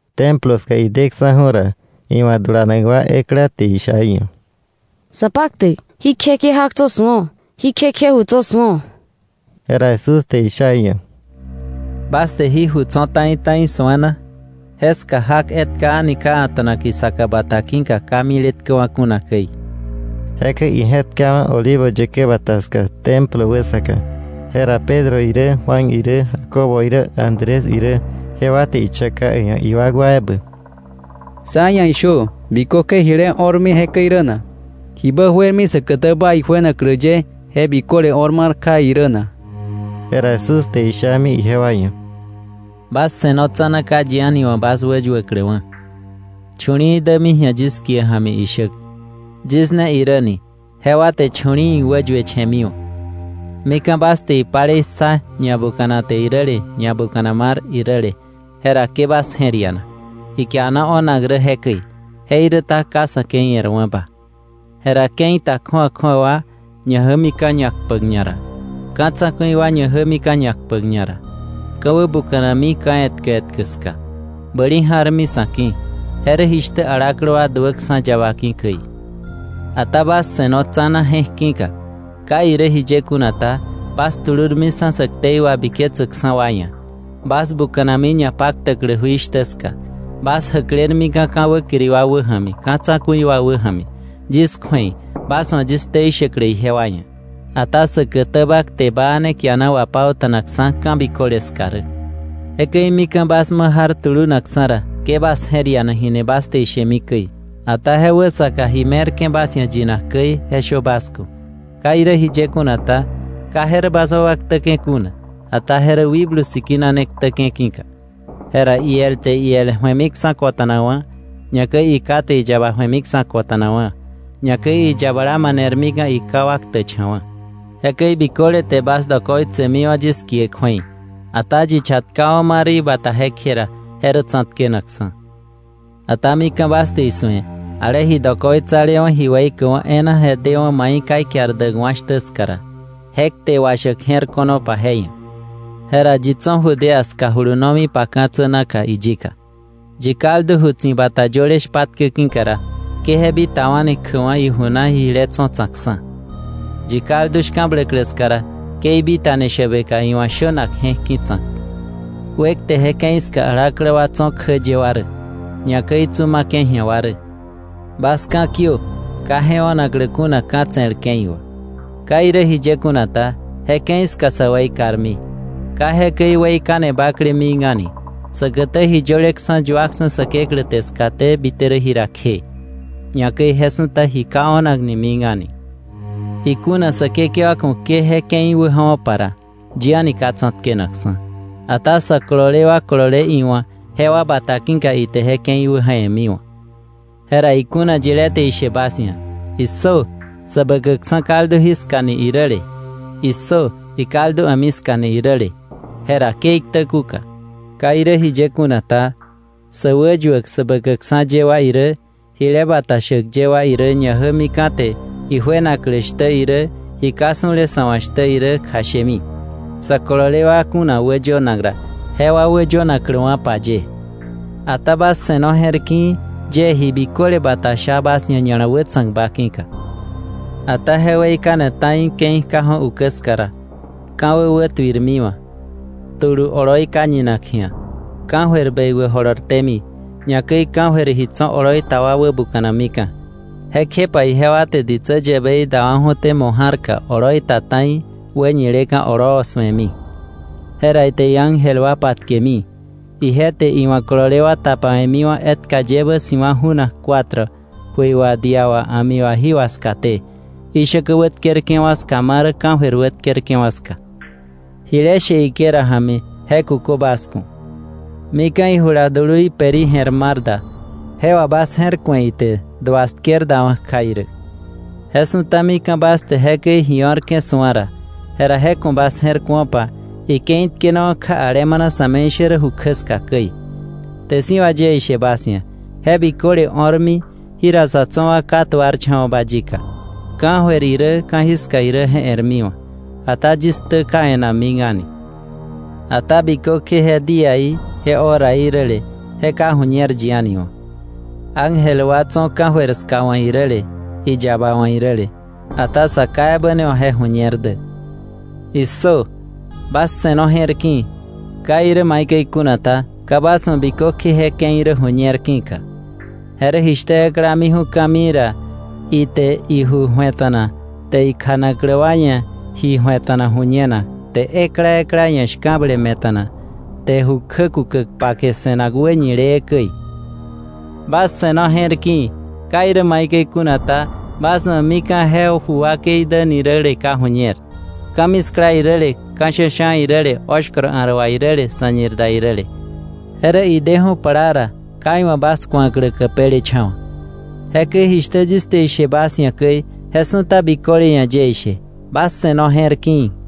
Templo ska ideksa̱ju̱ ra, iwa̱ dulanak wa ekla te isha iia̱: —Sapaktäk, ¡Jí kje kje jak tso̱ su̱o! ¡Jí kje kje ju tso̱ su̱o! Jera Jesús te isha iia̱: —¿Bas te jí ju tso̱ ta̱i ta̱i su̱a na? Jeska jak etka a̱ni ka a̱ta̱nak isaka bata ki̱ka, ka miletkäwa̱ kuna käi. Jekäi ije̱tkawa̱ Olivo yäkä Bata ska Templo wäsaka. Jera Pedro irä Juan irä Jacobo irä Andrés irä, jewa te ichaka iia̱ iwakwa ebä: —“Sá ia̱ ishö: ¿bikökje jile o̱rmi jekäi rä na? ¿Jibä juermi säkätäba ijuenaklä ye je biköle o̱r mar kja irä na?” Jera Jesús te ishami ijewa ia̱: —Bas se̱no tsa̱na ka yi a̱ni wa̱ bas wäyuäkläwa̱. Chu̱li̱i̱ dämi ji̱a yis kie ja̱mi ishäk: ‘Yis ne irä’ ni, jewa te chu̱li̱i̱ wäyueche̱miwa̱. “Mika̱ bas te ipalei ssa ñabukanate iräle, ñabukana mar iräle, jera ke bas je̱r ianak. Ikiana o̱nak rä jekäi, jeiräta ka sa̱ ke̱i e̱rwa̱ba. Jera ke̱i ta kju̱awa kju̱awa wa ñajämika̱ ñakpäk ñara, ka̱ tsa̱ku̱i wa ñajämika̱ ñakpäk ñara. Ka̱ wäbuka̱nami ka̱ etkä etkä ska. Bäli ja̱rmi sa̱ ki̱. Je rä jishtä alaklä wa duäksa̱ yaba ki̱ käi. “Ata bas se̱no tsa̱na je̱k ki̱ka. Ka irä jiye kuna ta, bas tulurmiksa̱ sä ktei wabiketsäkksa̱ wa ia̱. Bas buka̱nami ñapaktäklä jui shtä ska. Bas jäklermika̱ ka̱ wäkiri wa wäja̱mi, ka̱ tsa̱ku̱i wa wäja̱mi, yis kju̱ei, bas wa̱ yis ktei shäklä ijewa ia̱. Ata säkätäba kte baa ne kiana wapauta̱nakksa̱ ka̱ biköle ska rä. Jekäi mika̱ bas ma jar tulunakksa̱ ra, ke bas je̱r ianak jini bas te ishemi käi. Ata je wäsaka ji me̱rke̱ bas ia̱ yinak käi, je shö bas ku̱. Ka irä jiye kuna ta, ka je rä bas wakwa ktäke̱ kuna, ata je rä Wikblu Sikina ne ktäke̱ ki̱ka. Jera iel te iel ebä ju̱emiksa̱ kota̱nakwa̱; ñakäi iká te iyaba ju̱emiksa̱ kota̱nakwa̱; ñakäi iyabala manermika̱ iká wa ktäkcha̱wa̱. Jekäi biköle te bas dokoitsemiwa̱ yis kie kju̱ei. Ata yi chatkawa̱ ma rä ibata jekje ra, je rä tsa̱tkenakksa̱. “Ata mika̱ bas te isu̱e ale ji dokoitsalewa̱ ji weikäkwa̱ e̱e̱na je dewa̱ mai ka ikiar däkwa̱ shtä ska ra (je kte washäk je̱r ko̱nopa je ia̱), jera yi tso̱ Judea ska julunomipa ka̱tsä naka iyika. Yi kaldu ju tsibata yöle shpatke ki̱ ra, ke je bitawa̱ni kjäkwa̱ iju na jile tso̱ tsa̱kksa̱. Yi kaldu shka̱bläklä ska ra, ke ibitani shäbeka iwa̱ shönak je̱k ki̱ tsa̱k. ¡Wekte je ke̱i ska alaklä wa tso̱ kjä ye wa rä, ñakäi tsu ma̱ke̱ ji̱a wa rä! Bas ka̱kiö ka je o̱naklä kuna ka̱ tse̱l ke̱i wà. Ka irä jiye kuna ta, je ke̱i ska sä weikarmi, ka jekäi weikane bakle mik a̱ni säkätä ji yöleksa̱ yuaksa̱ Säkeklä te skaté bite rä jira kje, ñakäi je su̱ta ji ka o̱nakni mik a̱ni. Ikuna Säkekewa ku̱ ke je ke̱i wäja̱wo̱pa ra, yi a̱ni ka tsa̱tkenakksa̱; ata sä kolole wa kolole iwa̱ jewa bata ki̱ka ite je ke̱i wäja̱we̱miwa̱. “Jera ikuna yilé te ishe bas ia̱: ‘¡Issö! Säbäkäkksa̱ kaldu jiska’ ni iräle, ‘¡Issö! Ikaldu a̱mi ska’ ni iräle, jera ke iktä kuka. Ka irä jiye kuna ta, sä wäyuäk sä bäkäkksa̱ ye wa irä, jile bata shäk ye wa irä, ñajämika̱ te ijuenaklä shtä irä, ji ka su̱le sa̱ wa̱ shtä irä kjashemi, sä kolole wa kuna wäyönak ra, jewa wäyönakläwa̱pa ye. Ata bas se̱no je̱r ki̱i̱, yie ji biköle bata sha bas ia̱ ña̱la wätsa̱kba ki̱ka. “Ata je weikane ta̱i ke̱i kjaju̱ ukä ska ra, ka̱wä wätuirmiwa̱, tulu oloi ka ñinak ji̱a, ka̱jöir bekwä jolortémi, ñakäi ka̱jöir ji tso̱ oloi ta wa wäbuka̱namika̱. Jekjepa ijewa te ditsä yäbei dawa̱ju̱té mo̱ ja̱rka oloi ta ta̱i, wäñileka̱ oloo su̱emi. Jera ite iángel wa patkemi, ije te iwa̱ kolole wa tapawe̱miwa̱ etka yebä si̱wa̱ ju̱nak cuatro, jöi wà dia wà a̱mi wà jí wà skaté, ishäkä wätkerke̱wa̱ ska ma rä ka̱jöir wätkerke̱wa̱ ska.’ “Jile she higuera ja̱mi, je kukö bas ku̱: Mika̱ ijula dului peri jè̱r mar da, je wà bas je̱r ku̱e ite duas tker dawa̱ kja irä. Je su̱ta mika̱ bas te jekäi ji o̱rke̱ su̱a ra, jera je ku̱ bas je̱r ku̱opa ike̱i tkenawa̱ kja alemana ju kjä ska irä. Kte si̱ wà yie ishe bas ia̱, je biköle o̱rmi jira sa̱ tso̱ wa ka tuarcha̱wa̱ba yika. Ka̱jöir irä ka̱jiska irä je e̱rmiwa̱, ata yis ktä ka e̱nakwa̱ mik a̱ni. “Ata bikökje je díaí, je horaí räle, je ka ju̱ñer yi a̱ni wa̱, ángel wa tso̱ ka̱jöir ska wa̱ iräle, iyaba wa̱ iräle; ata Sa Ká ebä ne wa̱ je ju̱ñer dä. “¡Issö, bas se̱no je̱rki̱i̱! Ka irä maikäi kuna ta, ka bas wa̱ bikökje je ke̱i rä ju̱ñer ki̱ka. Je rä jishtä ekla miju̱ ka̱mii ra, ite iju ju̱eta̱na te ikjanaklä wa ia̱ ji ju̱eta̱na ju̱ñenak, te ekla ekla ia̱ shka̱ble me̱ta̱na, te ju kjä kukäk pake se̱nak wäñilee käi. Bas se̱no je̱r ki̱i̱. Ka irä maikäi kuna ta, bas wa̱ mika̱ je ju wakei däni räle ka ju̱ñer; ka̱miskla iräle, ka̱ sha̱sha̱ iräle, oshkoro a̱r wà iräle, sa̱ñir da iräle; je rä ideju̱ plaa ra, ka iwa̱ bas ku̱aklä käpelecha̱wa̱. Jishtä yis te ishe bas ia̱, jekäi biköle ia̱ yie ishe: Bas se̱no je̱r ki̱i̱.”